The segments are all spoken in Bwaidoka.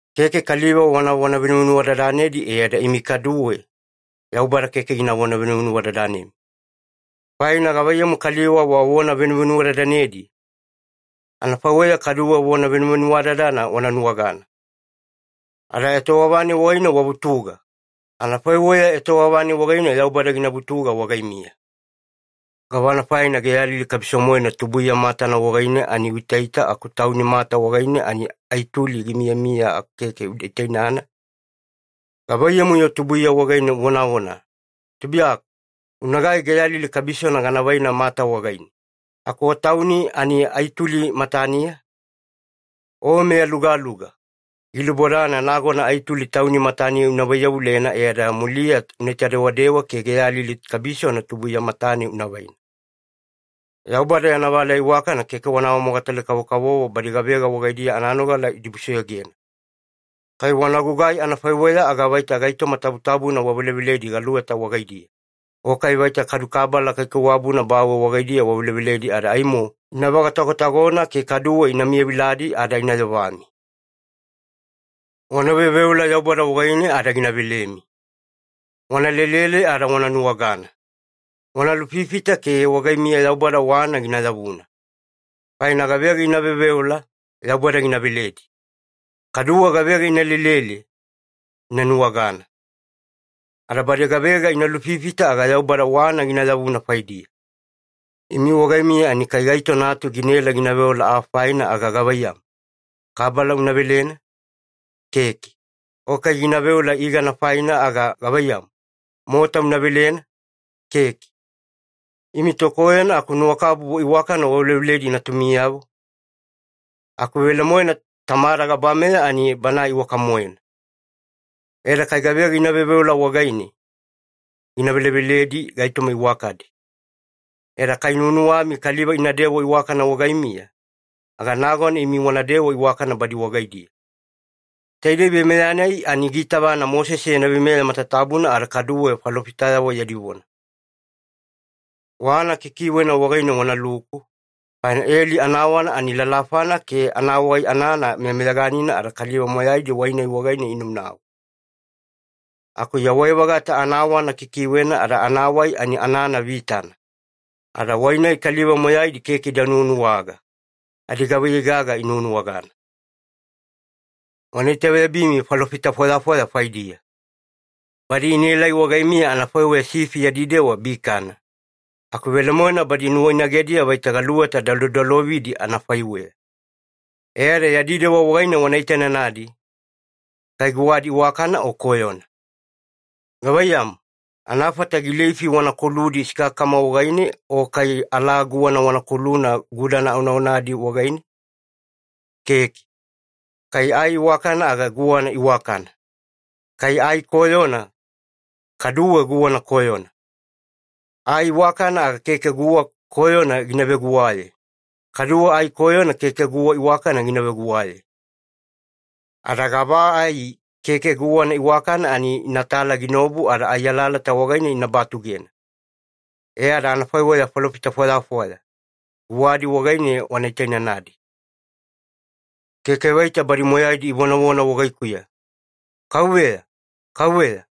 “Keke kaliva wanavona venuvenuwadadanedi, e ada imi kaduwe Yaubada keke ginavona venuvenuwadadanemi. Faina gavaiyamu kaliva wavona venuvenuwadadanedi, anafaiweya kaduwe vona venuvenuwadadana wana nuwagana. Ada etowava-nai wagaine wavutuga, anafaiweya etowava-nai wagaine Yaubada gina vutuga wagaimiya. Gavana faina geyalili kabiso-moena tubuiya matana wagaine ani uitaita, aku tauni mata wagaine ani ai tuli gimiyamiya, aku keke uda itainana? Gavaiyamu-yo tubuiya wagaine uvonavona, ‘Tubuiyaku, unagai geyalili kabisona gana vaina mata wagaine,’ aku o tauni ani ai tuli mataniya? O meyalugaluga, gilubodana nagona ai tuli tauni mataniya una vaiyavulena, e ada muliya unaita dewadewa ke geyalili kabisona tubuiya matane una vaina. “Yaubada yana valeya iwakana keke wana awamogatale kavokavovo badi gavega wagaidiya ananogala idibusoyogena. Kai wana gugai anafaiweya, aga vaita gaitoma tabutabuna waveleveledi galuweta wagaidiya, o kai vaita kadu kabala kaikaiwabuna bawe wagaidiya waveleveledi. Ada aimo ina vagatagotagona, ke kaduwe ina miyaviladi ada ina yovami. “Wana veoveola Yaubada wagaine ada gina velemi. Wana lelele ada wana nuwagana. Wana lufifita ke wagaimiya Yaubada wana gina yavuna. Faina gavega ina veoveola, Yaubada gina veledi. Kaduwe gavega ina lelele, ina nuwagana. Ada badi gavega ina lufifita, aga Yaubada wana gina yavuna faidiya. Imi wagaimiya ani kai gaito natu ginaela gina veola aa faina aga gavaiyamu, kabala una velena? Keke. O kai gina veola igana faina aga gavaiyamu, mota una velena? Keke. Imi tokoyona aku nuwakabubu iwakana waveleveledi natumiyavo, aku velemoena Tamada gabameya ani Banae iwaka-moena. E ada kai gavega ina veoveola wagaine, gina veleveledi gaitoma iwakadi. E ada kai nuwanuwami kaliva inadewa iwakana wagaimiya, aga nagona imi wanadewa iwakana badi wagaidiya. Taidei veimeya-nai, ani giitavana Mosese yana veimeya matatabuna ada kaduwe falofitayavo yadi vona. “Wana kikiwena wagaine wanaluku, faina eli anawana ani lalafana ke anawai anana meyameyaganina ada kaliva moyaidi wai-nai wagaine inaunau. Aku yawai-vagata anawana kikiwena ada anawai ani anana vitana, ada wai-nai kaliva moyaidi keke ida nuwanuwaga, adigavaiyei gaga inuwanuwagana. “Wana itaveyabimi falofita fwayafwaya faidiya. Badi inaelai wagaimiya anafaiweya sifi yadi dewa bikana, aku velemoena badi nuwainagediya vaita galuweta dalodalovidi anafaiweya. E ada yadi dewa wagaine wana itainanadi, kai guwadi iwakana o koyona. Gavaiyamu, anafata gileifi wana koludi sikakakama wagaine o kai alaa guwana wana koluna gudana onaonagidi wagaine? Keke. Kai ai iwakana, aga guwana iwakana. Kai ai koyona, kaduwe guwana koyona. Ai iwakana aga keke guwa koyona gina veguwaye, kaduwe ai koyona keke guwa iwakana gina veguwaye. Ada gava ai keke guwana iwakana, ani inatala ginaobu ada ai alalata wagaine ina batugena. E ada anafaiweya falofita fwayafwaya, guwadi wagaine wana itainanadi. “Keke vaita badi moyaidi ivonavona wagaikuya ‘Kauveya, Kauveya’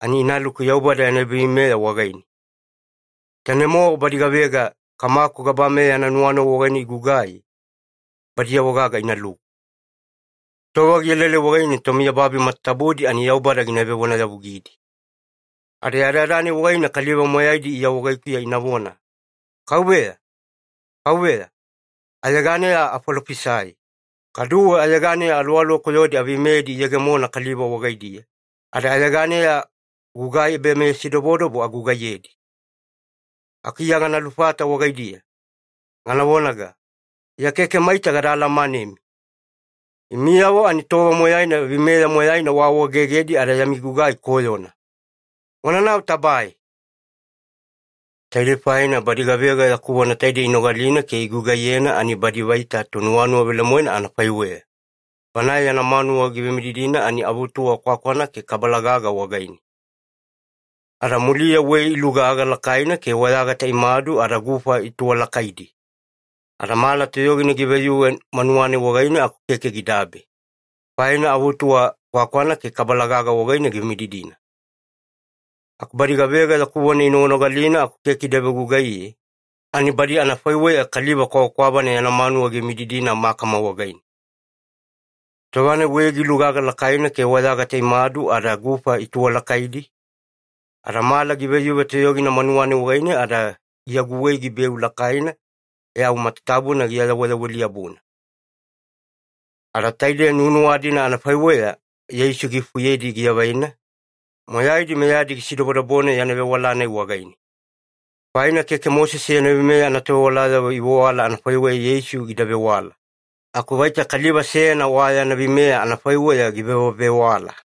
ani inaluku Yaubada yana ebaveimeya wagaine. Tainei-mowa badi gavega Kamaku gabameya yana nuwanuwa wagaine igugai, badiyavo-gaga inaluku. Tova gielaelai wagaine tomiyababi matatabudi ani Yaubada gina vevonayavugidi. Ada yadayada-nai wagaine, kaliva moyaidi Iya wagaikuya inavona ‘Kauveya, Kauveya, ayeganeya afalofisai, kaduwe ayeganeya aluwaluwa koyodi aveimeyedi iyegemona kaliva wagaidiya, ada ayeganeya gugai ebameyasidobodobo agugaiyedi.’ Aku Iya gana lufata wagaidiya, gana vonaga, ‘Iya keke maita gada alamanemi. Imiyavo ani tova moyaina veimeya moyaina waawaegegedi ada yami gugai koyona. Wananau tabae!’ “Taidei faina badi gavega yaku vona taidei inogalina ke igugaiyena ani badi vaita tonuwanuwa velemoena anafaiweya, bana yana manuwa givemididina ani anaavutuwa kwakwana ke kabala-gaga wagaine. Ada muliya wei gilugaga lakaina ke wayagata imadu ada gufa ituwalakaidi. Ada mala toyogina giveyuve manuwa-nai wagaine aku keke gidabe, faina avutuwa kwakwana ke kabala-gaga wagaine givemididina. “Aku badi gavega yaku vona inoganogalina aku keke ida vegugaiye, ani badi anafaiweya kaliva kwavakwavana yana manuwa givemididina makama wagaine. Tova-nai wei gilugaga lakaina ke wayagata imadu ada gufa ituwalakaidi, ada mala giveyuve toyogina manuwa-nai wagaine ada giaguwei gibeu lakaina, e au matatabuna giayaweyaweli-yabuna.” Ada taide nuwanuwa-dina anafaiweya Yeisu giifufuyedi giavaina, moyaidi meyadi gisidobodobona yana vewala-nai wagaine. Faina keke Mosese yana veimeya anatovewalayavo ivewala anafaiweya Yeisu gida vewala, aku vaita kaliva seyana wa yana veimeya anafaiweya givewavewala.